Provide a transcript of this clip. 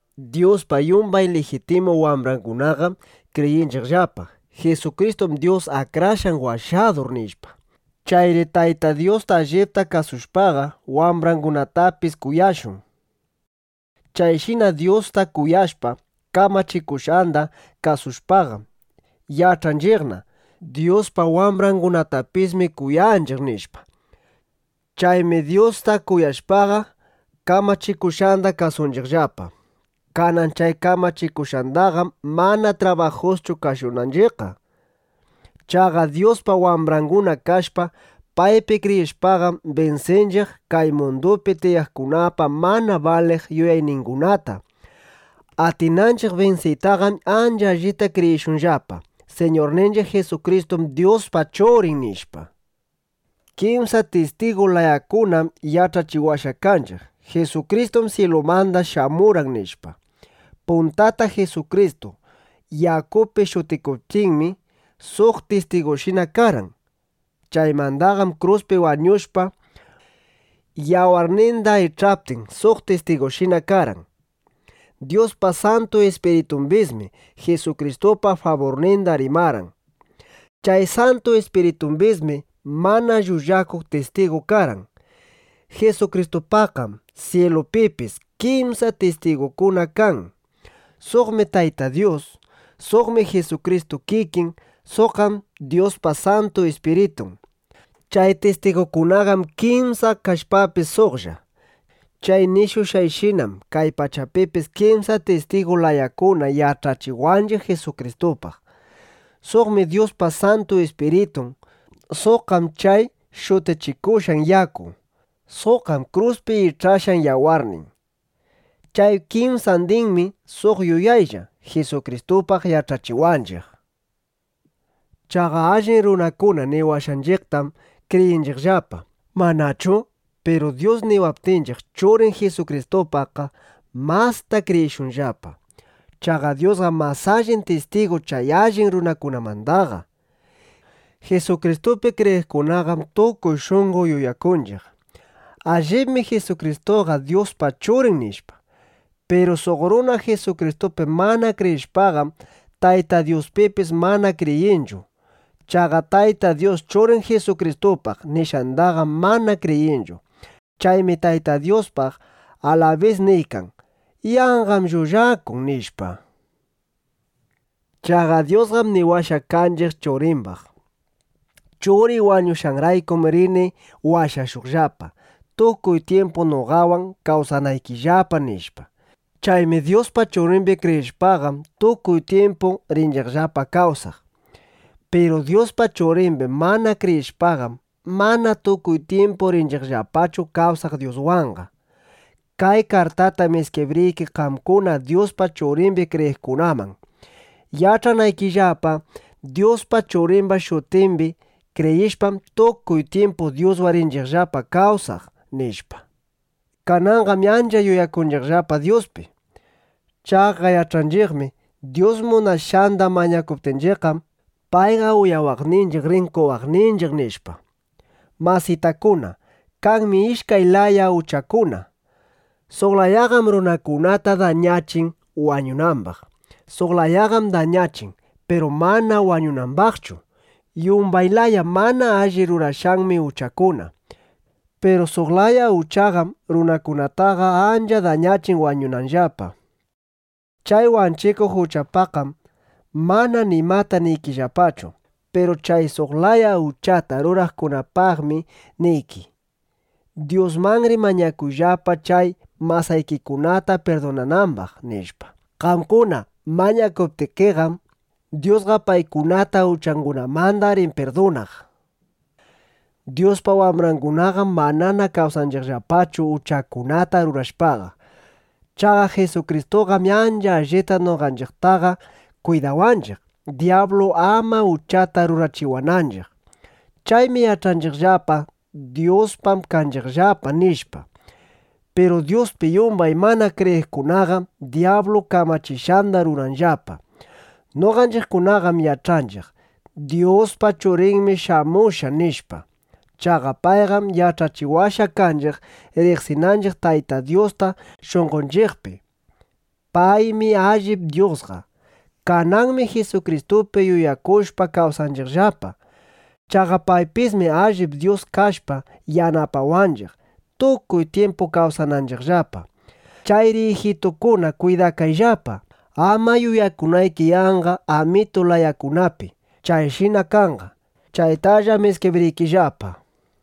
Dyuspa yumbay lijitimu wambrangunaqam kriyinchiqllapa: Jisukristum Dyus Akrashqan Washadur, nishpa. Chayri Tayta Dyusta allipta kuyashpaqa, wambrangunatapis kuyashun. Chayshina Dyusta kuyashpa, kamachikushqanda kasushpaqam, yach'anchiqna: Dyuspa wambrangunatapismi kuyaykanchiq, nishpa. Chaymi Dyusta kuyashpaqa, kamachikushqanda kasunchiqllapa. Kanan chay kamachikushqanqam mana trabajuschu kasunanchiqqa. Chaqa Dyuspa wambranguna kashpa, paypi kriyishpaqam, binsinchiq kay mundupi tiyaqkunapa mana baliq yuyayningunata. Atinanchiq binsiytaqam ancha allita kriyishunllapa: Siñurninchiq Jisukristum Dyuspa Churin, nishpa. Kimsa tistigu layakunam yach'achiwashqa kanchiq: Jisukristum syilumanda shamurqan, nishpa. Puntata Jisukristu yakupi shutikuptinmi, suq tistigushina karqan. Chaymandaqam kruspi wañushpa, yawarninda ich'aptin, suq tistigushina karqan. Dyuspa Santu Ispiritumbismi Jisukristupa faburninda rimarqan. Chay Santu Ispiritumbismi mana llullakuq tistigu karqan. Jisukristupaqqam ˻syilupipis˼ kimsa tistigukuna kan. ˻Suqmi Tayta Dyus. Suqqam Jisukristu kikin. Suqqam Dyuspa Santu Ispiritun. Chay tistigukunaqam kimsa kashpapis suqlla. Chay nishushqayshinam kay pachapipis kimsa tistigu layakuna yach'achiwanchiq Jisukristupaq.˼ Suqmi Dyuspa Santu Ispiritun, suqqam chay shutikushqan yaku, suqqam kruspi ich'ashqan yawarnin. Chay kimsandinmi suq yuyaytalla Jisukristupaq yach'achiwanchiq. Chaqa allin runakuna niwashqanchiqtam kriyinchiqllapa, ¿manachu? Piru Dyus niwaptinchiq Churin Jisukristupaqqa, masta kriyishunllapa. Chaqa Dyusqam mas allin tistigu chay allin runakunamandaqa. Jisukristupi kriyiqkunaqam tukuy shunqo yuyakunchiq: Allibmi Jisukristuqa Dyuspa Churin, nishpa. Piru suq runa Jisukristupi mana kriyishpaqam, Tayta Dyuspipis mana kriyinchu. Chaqa Tayta Dyus Churin Jisukristupaq nishqandaqam mana kriyinchu. Chaymi Tayta Dyuspaq alabis niykan: “Yanqam llullakun” nishpa. Chaqa Dyusqam niwashqa kanchiq Churimbaq: “Churiy wañushqanraykum rini washashuqllapa, tukuy tyimpu noqawan kawsanaykillapa”, nishpa. Chaymi Dyuspa Churimbi kriyishpaqam, tukuy tyimpu rinchiqllapa kawsaq. Piru Dyuspa Churimbi mana kriyishpaqam, mana tukuy tyimpu rinchiqllapachu kawsaq Dyuswanqa. Kay kartatam iskibriyki qamkuna Dyuspa Churimbi kriyiqkunaman, yach'anaykillapa: Dyuspa Churimba shutimbi kriyishpam, tukuy tyimpu Dyuswan rinchiqllapa kawsaq, nishpa. Kananqam ancha yuyakunchiqllapa Dyuspi. Chaqa yach'anchiqmi: Dyus munashqanda mañakuptinchiqqam, payqa uyawaqninchiq, rin qowaqninchiq, nishpa. Masitakuna, kanmi ishkay laya uchakuna. Suq layaqam runakunata dañachin wañunambaq. Suq layaqam dañachin, piru mana wañunambaqchu. Yumbay laya mana alli rurashqanmi uchakuna. Piru suq laya uchaqam runakunataqa ancha dañachin wañunanllapa. Chay wanchikuq uchapaqqam mana nimata niykillapachu. Piru chay suq laya uchata ruraqkunapaqmi niyki: Dyusmanri mañakuyllapa chay masaykikunata pirdunanambaq, nishpa. Qamkuna mañakuptikiqam, Dyusqa paykunata uchangunamanda rin pirdunaq. Dyuspa wambrangunaqam manana kawsanchiqllapachu uchakunata rurashpaqa. Chaqa Jisukristuqam ancha allita noqanchiqtaqa kwidawanchiq, dyablu ama uchata rurachiwananchiq. Chaymi yach'anchiqllapa: Dyuspam kanchiqllapa, nishpa. Piru Dyuspi yumbay mana kriyiqkunaqam dyablu kamachishqanda ruranllapa. Noqanchiqkunaqam yach'anchiq: Dyuspa Churinmi shamushqa, nishpa. Chaqa payqam yach'achiwashqa kanchiq, riqsinanchiq Tayta Dyusta shunqonchiqpi. Paymi allip Dyusqa. Kananmi Jisukristupi yuyakushpa kawsanchiqllapa. Chaqa paypismi allip Dyus kashpa yanapawanchiq, tukuy tyimpu kawsananchiqllapa. Chayri ijitukuna, kwidakayllapa, ama yuyakunayki yanqa amitu layakunapi. Chayshina kanqa. (Chaytallam iskibriykillapa.)